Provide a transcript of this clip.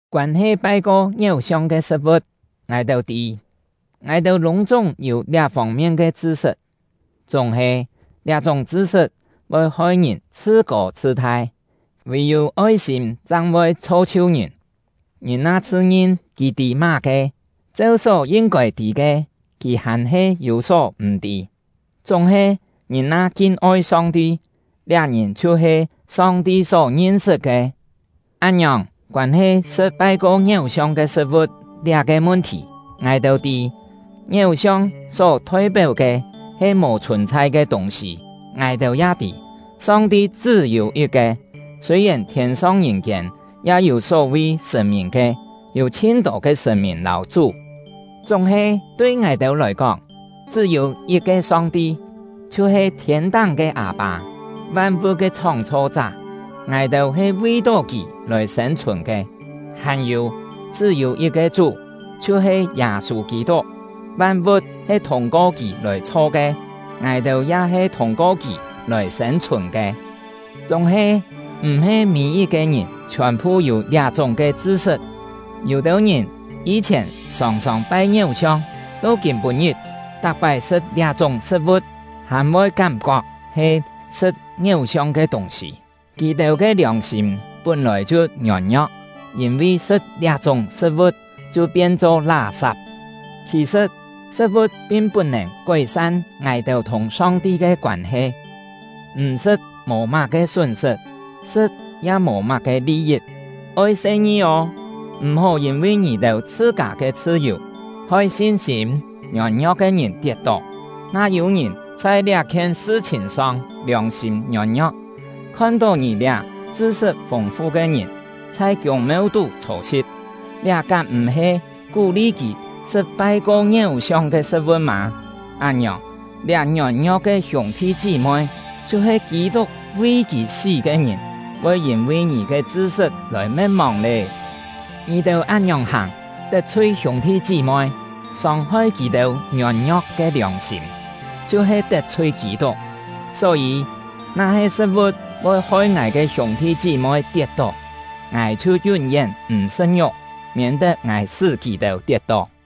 Koân-he pai-ko ngiéu-siong ke sṳ̍t-vu̍t, ngài-têu tî, “Ngài-têu lûng-chúng yû liá fông-mien ke chṳ-sṳt”. Chúng-he, liá-chúng chṳ-sṳt voi hoi-ngìn chhṳ-kô chhṳ-thai; vì-yû oi-sîm chang voi chho-chhiu ngìn. Ngìn na chhṳ-ngin kì tî má-ke, cheu só yin-kôi tî ke, kì hàn-he yû só m̀-tî. Chúng-he, ngìn na kin-oi Song-ti, liá ngìn chhiu-he Song-ti só ngin-sṳt ke. Án-ngiòng, koân-he sṳ̍t pai-ko ngiéu-siong ke sṳ̍t-vu̍t liá-ke mun-thì, ngài-têu tî, ngiéu-siong só thoi-péu ke he mò chhùn-chhai ke tûng-sî; ngài-têu ya tî, Song-ti chṳ́-yû yit-ke. Sûi-yèn thiên-song ngìn-kiên ya yû só-vi “sṳ̀n-mìn” ke, (yû chhin-tô ke “sṳ̀n-mìn” lâu “chú”), chúng-he tui ngài-têu lòi kóng, chṳ́-yû yit-ke Song-ti, chhiu-he thiên-táng ke Â-pâ — van-vu̍t ke Chhóng-chho-chá; ngài-têu he vi-tó Kì lòi sên-chhùn ke. Hàn-yû, chṳ́-yû yit-ke Chú, chhiu-he Yâ-sû Kî-tuk; van-vu̍t he thûng-ko kì lòi chho ke, ngài-têu ya he thûng-ko kì lòi sên-chhùn ke. Chúng-he, m̀-he mî-yit-ke ngìn chhiòn-phu yû liá-chúng ke chṳ-sṳt. Yû-têu ngìn yî-chhièn sòng-sòng pai ngiéu-siong, to kîm-pû-ngit, tak-pái sṳ̍t liá-chúng sṳ̍t-vu̍t hàn voi kám-kok he sṳ̍t ngiéu-siong ke tûng-sî. Kì-têu ke liòng-sîm pún-lòi chhiu ngiôn-ngio̍k, yîn-vi sṳ̍t liá-chúng sṳ̍t-vu̍t, chhiu pien-cho lá-sap. Khì-sṳ̍t, sṳ̍t-vu̍t pin put-nèn kói-san ngài-têu thùng Song-ti ke koân-he; m̀ sṳ̍t mò má-ke sún-sṳt, sṳ̍t ya mò má-ke li-yit. Oi se-ngi ô! M̀-hó yîn-vi ngì-têu chhṳ-kâ ke chhṳ-yù hoi sin-sîm ngiôn-ngio̍k ke ngìn tiet-tó. Na yû-ngìn chhai liá-khien sṳ-chhìn-song liòng-sîm ngiôn-ngio̍k, khon-tó ngì liá “chṳ-sṳt fûng-fu” ke ngìn chhai kiûng-meu-tú chhô-si̍t, liá kám m̀-he kú-li kì sṳ̍t pai-ko ngiéu-siong ke sṳ̍t-vu̍t mâ? Án-ngiòng, liá ngiôn-ngio̍k ke hiûng-thi chí-moi, chhiu-he Kî-tuk vi kì sí ke ngìn, voi yîn-vi ngì ke “chṳ-sṳt” lòi me̍t-mòng lé! Ngì-têu án-ngiòng hàng, tet-chhui hiûng-thi chí-moi, sông-hoi kì-têu ngiôn-ngio̍k ke liòng-sîm, chhiu-he tet-chhui Kî-tuk. Só-yî, na-he sṳ̍t-vu̍t voi hoi ngài ke hiûng-thi chí-moi tiet-tó, ngài chhiu yún-yén m̀ sṳ̍t ngiuk, miên-tet ngài sṳ́ kì-têu tiet-tó.